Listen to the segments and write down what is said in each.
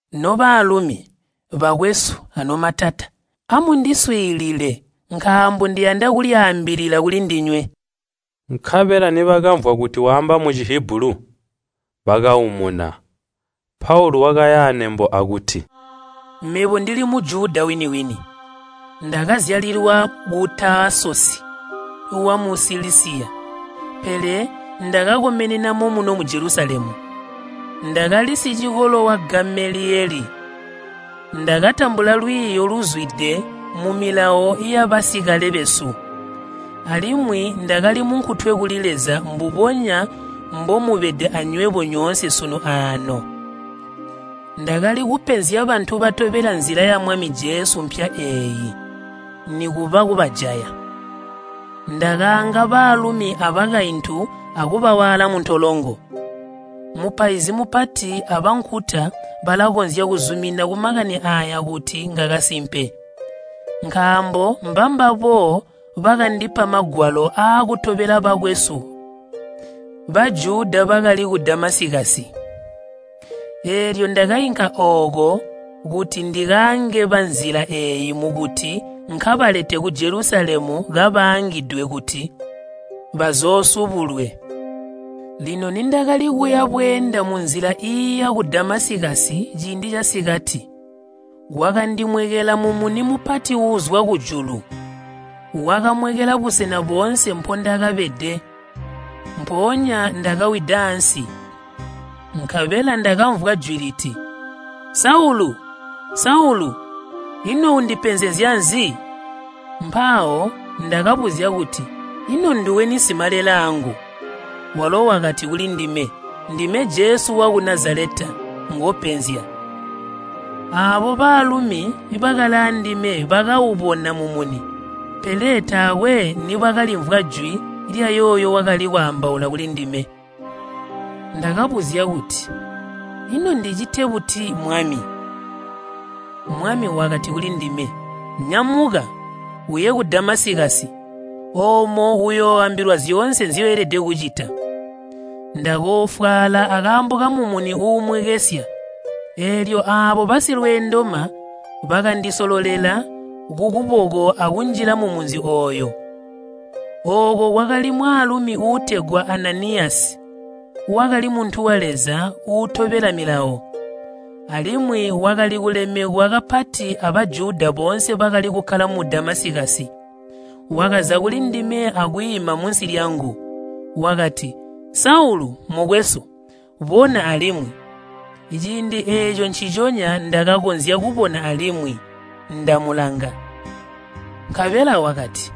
“Nobaalumi, bakwesu anomatata, amundiswiilile nkaambo ndiyanda kulyaambilila kulindinywe!” Nkabela nibakamvwa kuti waamba mu Cihibulu, bakaumuna, Paulu wakaya anembo akuti, “Mebo ndili Mujuda wini-wini, ndakazyalilwa ku Taasosi wamu Silisiya, pele ndakakomenena momuno mu Jelusalemu. Ndakali sicikolo wa Gameliyeli. Ndakatambula lwiiyo luzwide mu Milawo yabasikale besu, alimwi ndakali munkutwe kuli Leza mbubonya mbomubede anywebo nyoonse sunu aano. Ndakali kupenzya bantu batobela Nzila mpya eeyi, nikuba kubajaya. Ndakaanga baalumi abakaintu akubawaala muntolongo. Mupaizi Mupati abankuta balakonzya kuzumina kumakani aaya kuti ngakasimpe. Nkaambo mbambabo bakandipa magwalo aakutobela bakwesu Bajuda bakali ku Damasikasi. Eelyo ndakainka ooko kuti ndikaange banzila eeyi mukuti nkabalete ku Jelusalemu kabaangidwe kuti bazoosubulwe. “Lino nindakali kuya bweenda munzila iiya ku Damasikasi, ciindi casikati, kwakandimwekela mumuni mupati uuzwa kujulu, wakamwekela busena boonse mpondakabede. Mpoonya ndakawida ansi, nkabela ndakamvwa jwi liti, ‘Saulu, Saulu, ino undipenzezya nzi?’ Mpawo ndakabuzya kuti, ‘Ino nduweni Simalelaangu?’ Walo wakati kulindime, ‘Ndime Jesu waku Nazaleta ngopenzya.’ Aabo baalumi bakali aandime bakaubona mumuni, pele taakwe nibakalimvwa jwi lyayooyo wakali kwaambaula kulindime. Ndakabuzya kuti, ‘Ino ndicite buti, Mwami?’ Mwami wakati kulindime, ‘Nyamuka, uye mu Damasikasi, oomo uyooambilwa zyoonse nzyoelede kucita.’ Ndakoofwaala akaambo kamumuni uumwekesya, eelyo aabo basilweendoma bakandisololela kukuboko akunjila mumunzi ooyo. “Ooko kwakali mwaalumi uutegwa Ananiyasi, wakali muntu wa Leza uutobela Milawo, alimwi wakali kulemekwa kapati a Bajuda boonse bakali kukkala mu Damasikasi. Wakaza kulindime akwiima munsi lyangu. Wakati, ‘Saulu, mukwesu, bona alimwi!’ Ciindi eeco nciconya ndakakonzya kubona alimwi, ndamulanga. Nkabela wakati,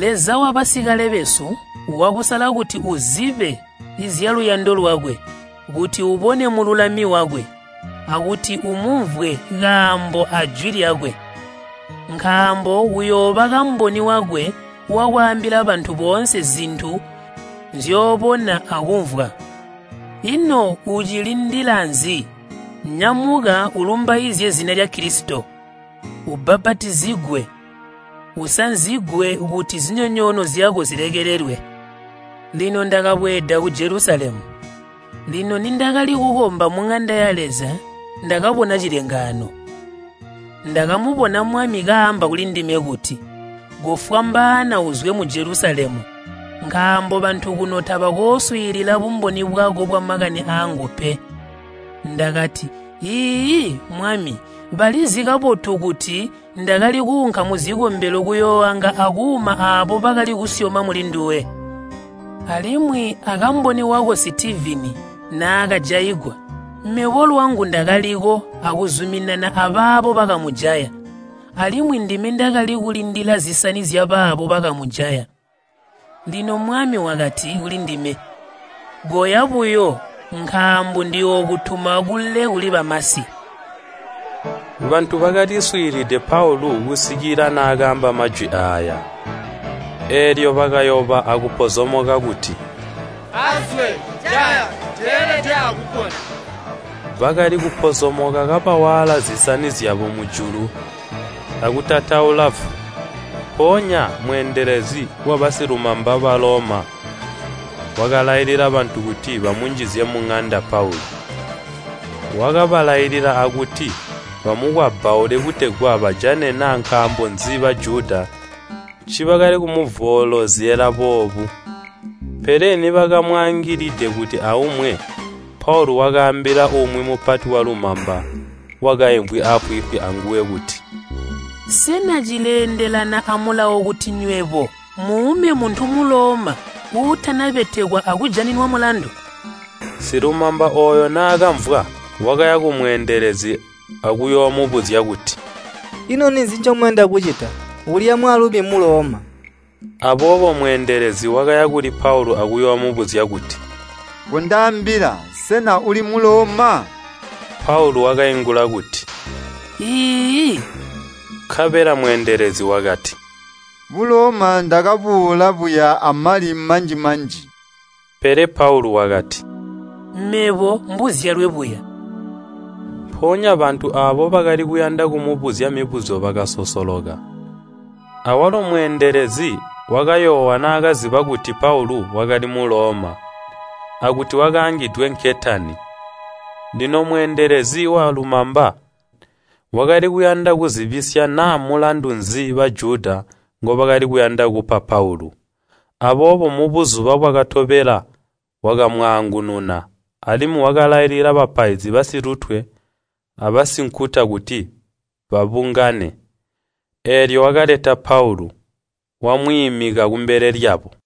‘Leza wabasikale besu wakusala kuti uzibe zyaluyando lwakwe, kuti ubone Mululami wakwe, akuti umumvwe kaamba ajwi lyakwe. Nkaambo uyooba kamboni wakwe wakwaambila bantu boonse zintu nzyoobona akumvwa. Ino ucilindila nzi? Nyamuka ulumbaizye zina lya Kilisito. Ubbapatizigwe, usanzigwe kuti zinyonyoono zyako zilekelelwe.’ “Lino ndakabweeda ku Jelusalemu. Lino nindakali kukomba muŋanda ya Leza ndakabona cilengaano. Ndakamubona Mwami kaamba kulindime kuti, ‘Kofwambaana uzwe mu Jelusalemu, nkaambo bantu kuno tabakooswiilila bumboni bwako bwamakani aangu pe.’ Ndakati, ‘Iiyi, Mwami, balizi kabotu kuti ndakali kuunka muzikombelo kuyooanga akuuma aabo bakali kusyoma mulinduwe. Alimwi akamboni wako Sitivini naakajaigwa, mebo lwangu ndakaliwo akuzuminana abaabo bakamujaya, alimwi ndime ndakali kulindila zisani zyabaabo bakamujaya.’ “Lino Mwami wakati kulindime, ‘Koya buyo nkaambo ndiyookutuma kule kuli bamasi.’” Bantu bakaliswiilide Paulu kusikila naakaamba majwi aaya, eelyo bakayoba akupozomoka kuti, “Azwe, jaya! Teelede akupona!” Bakali kupozomoka kabawaala zisani zyabo mujulu akutataula vu. Mpoonya mweendelezi wabasilumamba ba Baloma wakalailila bantu kuti bamunjizye muŋanda Paulu, wakabalailila akuti bamukwabbaule kutegwa bajane naa nkaambo nzi Bajuda ncibakali kumuvoolozyela boobu. Pele nibakamwaangilide kuti aumwe, Paulu wakaambila umwi mupati walumamba wakaimvwi aafwiifwi anguwe kuti, “Sena cileendelana amulawo kuti nywebo muume muntu Muloma uutanabetekwa akujaninwa mulandu?” Silumamba ooyo naakamvwa, wakaya kumweendelezi akuyoomubuzya kuti, “Ino ninzi ncomuyanda kucita? Uulya mwaalumi Muloma!” Aboobo mweendelezi wakaya kuli Paulu akuyoomubuzya kuti, “Kondaambila, sena uli Muloma?” Paulu wakaingula kuti, “Iiyi.” Nkabela mweendelezi wakati, “Buloma ndakabuula buya amali manji-manji.” Pele Paulu wakati, “Mebo mbuzyalwe buya.” Mpoonya bantu aabo bakali kuyanda kumubuzya mibuzyo bakasosoloka, awalo mweendelezi wakayoowa naakaziba kuti Paulu wakali Muloma, akuti wakaangidwe nketani. Lino mweendelezi walumamba wakali kuyanda kuzibisya naa mulandu nzi Bajuda ngobakali kuyanda kupa Paulu. Aboobo mubuzuba bwakatobela wakamwaangununa, alimwi wakalailila bapaizi basilutwe abasinkuta kuti babungane. Eelyo wakaleta Paulu, wamwiimika kumbele lyabo.